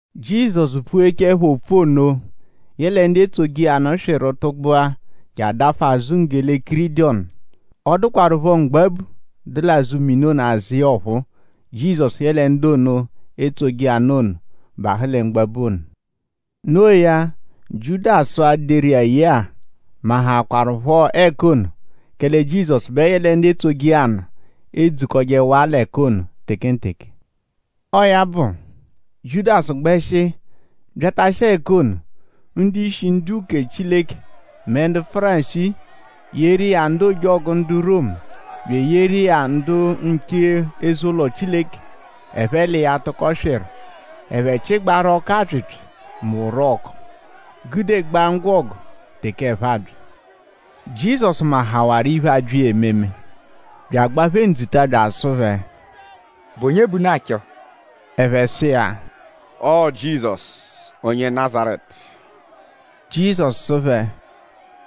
Jizọsu pfughechaẹpho opfu ono; yẹle ndu etsoje iya nụ swịru tụgbua je adafụ azụ nwanggele Kidirọnu. Ọ dụkwarupho mgbabu, dụ l'azụ mini ono azụ iya ọphuu. Jizọsu yẹle ndu ono, etsoje iya nụ ono bahụ lẹ mgbabu ono. Noo ya; Jiudasu-a, deru iya ye-a mahaakwarụpho ẹka ono; kẹle Jizọsu bẹ yẹle ndu etsoje iya nụ edzukọjehawaa l'ẹka ono tekenteke. Ọo ya bụ; Jiudasu gbẹshi byatashia ẹka ono. Ndu-ishi ndu-uke Chileke mẹ ndu Fárisii yeru iya ndu ojọgu ndu Romu; bya eyeru iya ndu nche eze-ụlo Chileke; ẹphe l'iya tụko swịru. Ẹphe chịgbaaru ọku-apyịpyi mẹ orọku gudegbaa ngwọgu teke ẹphe abya. Jizọsu mahawarụ iphe, abya iya ememe; bya agba phẹ ndzuta bya asụ phẹ: “?Bụ onye bẹ unu achọ?” Ẹphe sụ iya: “Ọo Jizọsu onye Nazaretu.” Jizọsu sụ phẹ: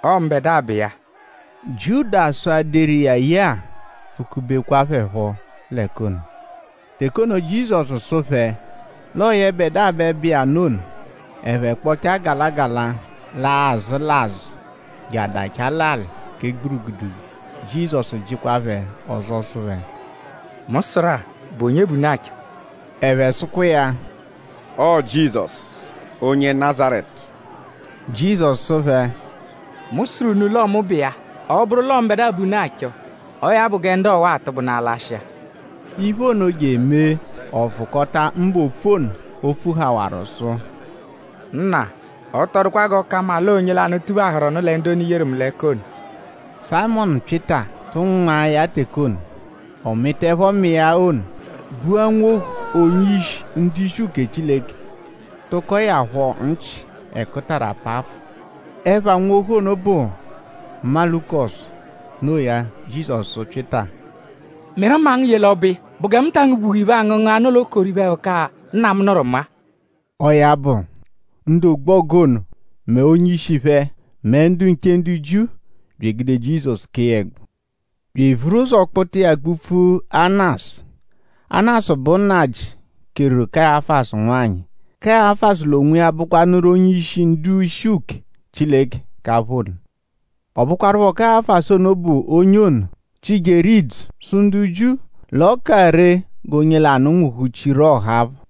“Ọo mbẹdua bụ iya.” Jiudasu, deru iya ye-a pfukubekwa phẹ phọ l'ẹka ono. Teke ono, Jizọsu sụru phẹ l'ọo yẹbedua bẹ bụ iya nụ ono; ẹphe kpọchaa gala gala laa l'azụ l'azụ je adachaa l'alị kẹ gburugudugu. Jizọsu jịkwaa phẹ ọzo sụ phẹ: “Mu sụru-a:?bụ onye bẹ unu achọ?” Ẹphe sụkwa iya: “Ọo Jizọsu, onye Nazaretu.” Jizọsu sụ phẹ: “Mu sụru unu l'ọo mu bụ iya. Ọ -bụru l'ọo mbẹdua bẹ unu achọ; ọo ya bụ gẹ ndu ọwa-a atụgbunaa lashịa.” Iphe ono je emee ọ vụkota mbụ opfu ono o pfuhawarụ sụ: “Nna; ọ tọ dụkwa g'ọ ka mma l'ọo onye lanụ, tuphahụru lẹ ndu ono, i yeru mu l'ẹka ono.” Sayịmonu Pyịta tu mma iya teke ono. Ọ mịtaepho mma iya ono; gbua nwohu onye-ishi ndu-ishi uke Chileke; tụkoe ya phọ nchị-ẹkutara pafụ. Ẹpha nwohu ono bụ Malukọsu. Noo ya; Jizọsu sụ Pyịta: “Mịru mma ngu ye l'ọbo iya.?Bụ gẹ mu ta angụ-gbuhẹ iphe, aangụ angụngu, nọ l'okoro iphe-ẹhuka-a, Nna mu nụru mu-a?” Ọo ya bụ; ndu ọgbogu ono mẹ onye-ishi phẹ; mẹ ndu nche ndu Jiu bya egude Jizọsu; kee ya ẹgbu; bya evuru ụzo kpụta iya kpụ-pfu Anasu. Anasu bụ nnajị, keru Kayafasu nwanyị. Kayafasu l'onwiya bụkwanuru onye-ishi ndu-ishi uke Chileke k'apha ono. Ọ bụkwarupho Kayafasu ono bụ onye ono, chịjeru idzu sụ ndu Jiu l'ọ ka ree g'onye lanụ nwụhu-chiaru ọha phọ.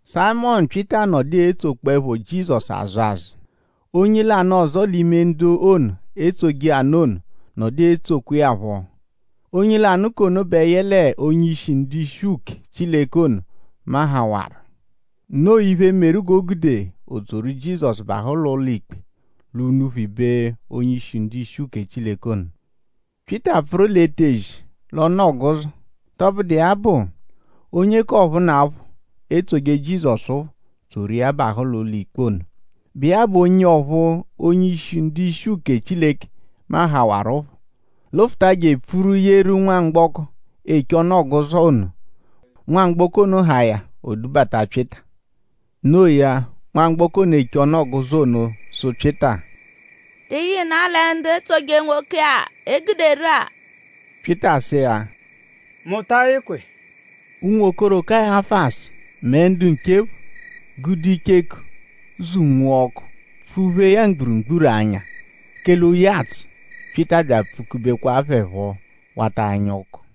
Sayịmonu Pyịta nọdu etsokpọepho Jizọsu azụ azụ. Onye lanụ ọzo l'ime ndu ono, etsoje iya nụ ono nọdu etsokwa iya phọ. Onye lanụ k'ono bẹ yẹle onye-ishi ndu-ishi uke Chileke ono mahawarụ. Noo iphe, meru g'o gude o tsoru Jizọsu bahụ l'ụlo-ikpe l'unuphu ibe onye-ishi ndu-ishi uke Chileke ono. Pyịta pfụru l'etezi l'ọnu-ọguzo. Tọbudu iya bụ; onye k'ọphunapho, etsoje Jizọsu phọ tsoru iya bahụ l'ụlo-ikpe ono, bụ iya bụ onye ọphu onye-ishi ndu-ishi uke Chileke mahawaruphọ; lụfuta je epfuru yeru nwamgbọko, eche ọnu-ọguzo ono. Nwamgbọko ono haa ya; o dubata Pyịta. Noo ya; nwamgbọko ono, eche ọnu-ọguzo ono sụ Pyịta: “?Tị yịnaa lẹ ndu etsoje nwoke-a, e guderu-a?” Pyịta sụ iya: “Mu ta ayịkwa iya.” Unwokoro Kayafasu mẹ ndu nche phọ gude icheku zụ-nwua ọku pfụ-phee ya mgburugburu anya; kẹle oyi atsụ. Pyịta bya apfukubekwa phẹ phọ wata anya ọku.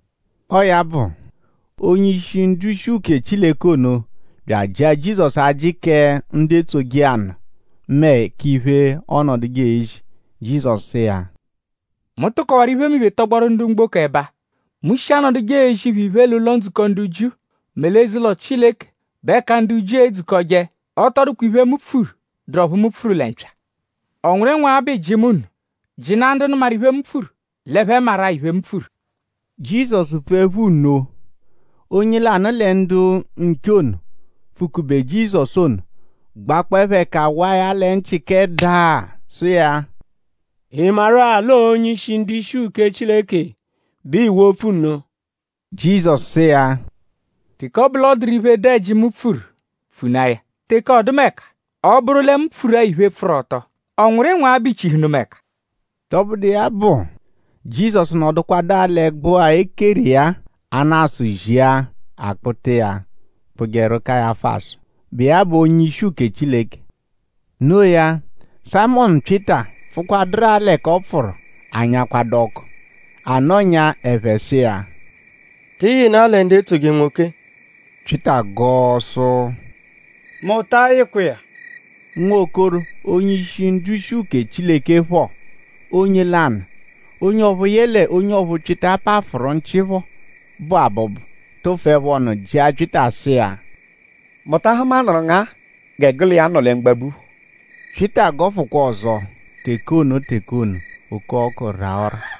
Ọo ya bụ; onye-ishi ndu-ishi uke Chileke ono bya ajịahaa Jizọsu ajị kẹ ndu etsoje iya nụ mẹ k'iphe, ọonoduje ezi. Jizọsu sụ iya: “Mu tụkowaru iphemiphe tọgboru ndu mgboko ẹba. Mu shi anọduje ezi phẹ iphe l'ụlo-ndzukọ ndu Jiu mẹ l'eze-ụlo Chileke, bụ ẹka ndu Jiu edzukọje. Ọ tọ dụkwa iphe, mu pfuru, dụru ọphu mu pfuru lẹ mpya. ?Ọ nwụru ịnwagha bẹ ịiji mu nno? Jịnaa ndu nụmaru iphe, mu pfuru; l'ẹphe maru-a iphe, mu pfuru.” Jizọsu pfuẹpho nno; onye lanụ lẹ ndu nche ono, pfụ-kube Jizọsu ono gbakpọepho ẹka waa ya lẹ nchị kẹ daa sụ iya: “?Ị maru-a l'ọo onye-ishi ndu-ishi uke Chileke bẹ ịiwo opfu nno?” Jizọsu sụ iya: “Teke ọ bụ l'ọ dụru iphe, dụ ẹji, mu pfuru; pfunaa ya. Teke ọdumeka; ọ -bụru lẹ mu pfuru-a iphe, pfụru ọto;?ọ nwụru ịnwagha bẹ iichihụnu mu ẹka?” Tọbudu iya bụ; Jizọsu nọdukwadu l'ẹgbu-a, e keru iya-a; Anasu zia; a kpụta iya kpụjeru Kayafasu, bụ iya bụ onye-ishi uke Chileke. Noo ya; Sayịmonu Pyịta pfụkwaduru-a l'ẹka ọ pfụru anyakwadụ ọku. A nọnyaa; ẹphe sụ iya: “?Tị yịnaa lẹ ndu etsoje nwoke-a?” Pyịta gọo sụ: “Mu ta ayịkwa iya.” Nwokoro onye-ishi ndu-ishi uke Chileke phọ onye lanụ; onye ọphu yẹle onye ọphu Pyịta pafụru nchị phọ bụ abụbu tụfuepho ọnu jịa Pyịta sụ iya: “?Mu ta ahụmanuru ngu-a gẹ gụ l'iya nọ lẹ mgbabu phọ?” Pyịta gọfukwa ọzo. Teke ono teke ono; oke-ọku raa ọ́rà.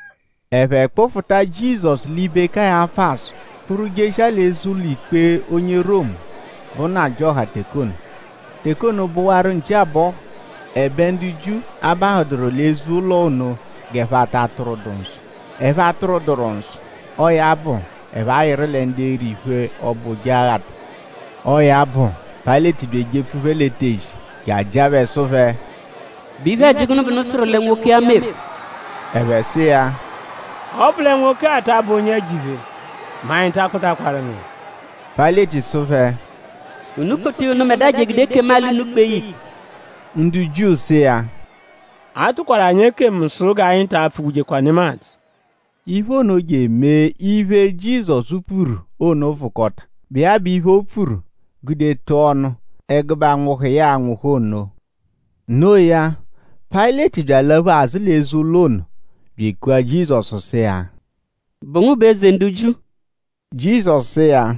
Ẹphe kpụfuta Jizọsu l'ibe Kayafasu kpụru jeshia l'eze ụlo-ikpe onye Romu, bụ nnajịoha teke ono. Teke ono bụwaru nchi abọhu. Ẹbe ndu Jiu abahụduru l'eze-ụlo ono g'ẹphe ata a-tụrwudu nsọ. Ẹphe -atụrwuduru nsọ; ọo ya bụ; ẹphe ayịru lẹ ndu e-ri iphe, ọbo Ojeghata. Ọo ya bụ; Payịleti bya ejepfu phẹ l'etezi je ajịa phẹ sụ phẹ: “?Bụ iphe-ẹji gụnu bẹ unu sụru lẹ nwoke-a meru?” Ẹphe sụ iya: “Ọ -bụ lẹ nwoke-a ta abụ onye ẹjo-iphe mẹ anyi ta akpụtakwaru ngu iya.” Payịleti sụ phẹ: “Unu kpụta iya unubẹdua je egude ekemu-alị unu kpee ya ikpe.” Ndu Jiu sụ iya: “A tụkwaru anyi ekemu sụ g'anyi ta apfụ-gbujekwa nemadzụ.” Iphe ono je emee iphe, Jizọsu pfuru ono vụkota, bụ iya bụ iphe, o pfuru gude tụa ọnu ẹgube anwụhu, ya a-nwụhu ono. Noo ya; Payịleti bya alaphu azụ l'eze-ụlo ono bya ekua Jizọsu sụ iya: “?Bụ ngu bụ Eze ndu Jiu?” Jizọsu sụ iya: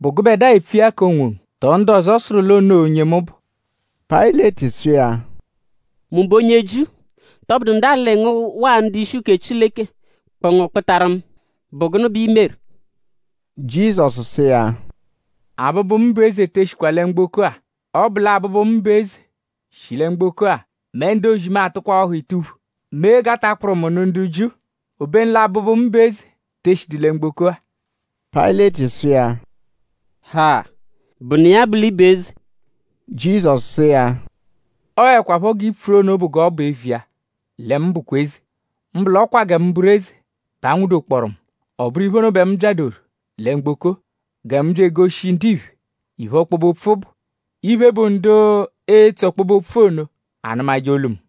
“?Bụ gụbedua epfu iya k'onwongu; tọo ndu ọzo sụru l'o noo onye mu bụ?” Payịleti sụ iya: “?Mu bụ onye Jiu??Tọbudu ndu alị ngu waa ndu-ishi uke Chileke kpụ ngu kpụtaru mu??Bụ gụnu bẹ i meru?” Jizọsu sụ iya: “Abụbu, mu bụ eze te eshikwa lẹ mgboko-a. Ọ -bụ l'abụbu, mu bụ eze shi lẹ mgboko-a mẹ ndu-ozi mu atụkwaa ọhu ituphu; mee g'a ta kpụru mu nụ ndu Jiu. Obenu l'abụbu, mu bụ eze te eshidu lẹ mgboko-a.” Payịleti sụ iya: “Ha!?Bụnu iya bụ l'ị bụ eze?” Jizọsu sụ iya: “Ọoekwa phọ g'i pfuru ono bụ g'ọ bụ eviya lẹ mu bụkwa eze. Mbụ l'ọ kwa gẹ mu bụru eze bẹ a nwụ-dokpọoru mu. Ọ bụru iphe ono bẹ mu byadoru lẹ mgboko-a; gẹ mu bya egoshi ndiphe iphe, ọkpobe-opfu bụ. Iphe, bụ ndu etso ọkpobe-opfu ono anụmaje olu mu.”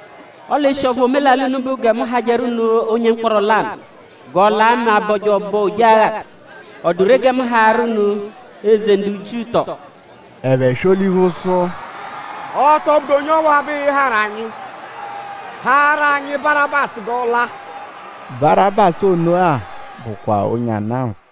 Ọle eshi ọphu omelalị unu bụ gẹ mu hajẹru unu onye mkpọro lanụ g'ọ la mẹ a -bọje ọbo Ojeghata;?ọ dụ ree gẹ mu haarụ unu Eze ndu Jiu tọo?” Ẹphe swọ-lihu sụ: “Ọ tọ bụdu onye ọwa bẹ ịi-harụ anyi; haarụ anyi Barabasu g'ọ la!” Barabasu ono-a bụkwa onye ana nfụ.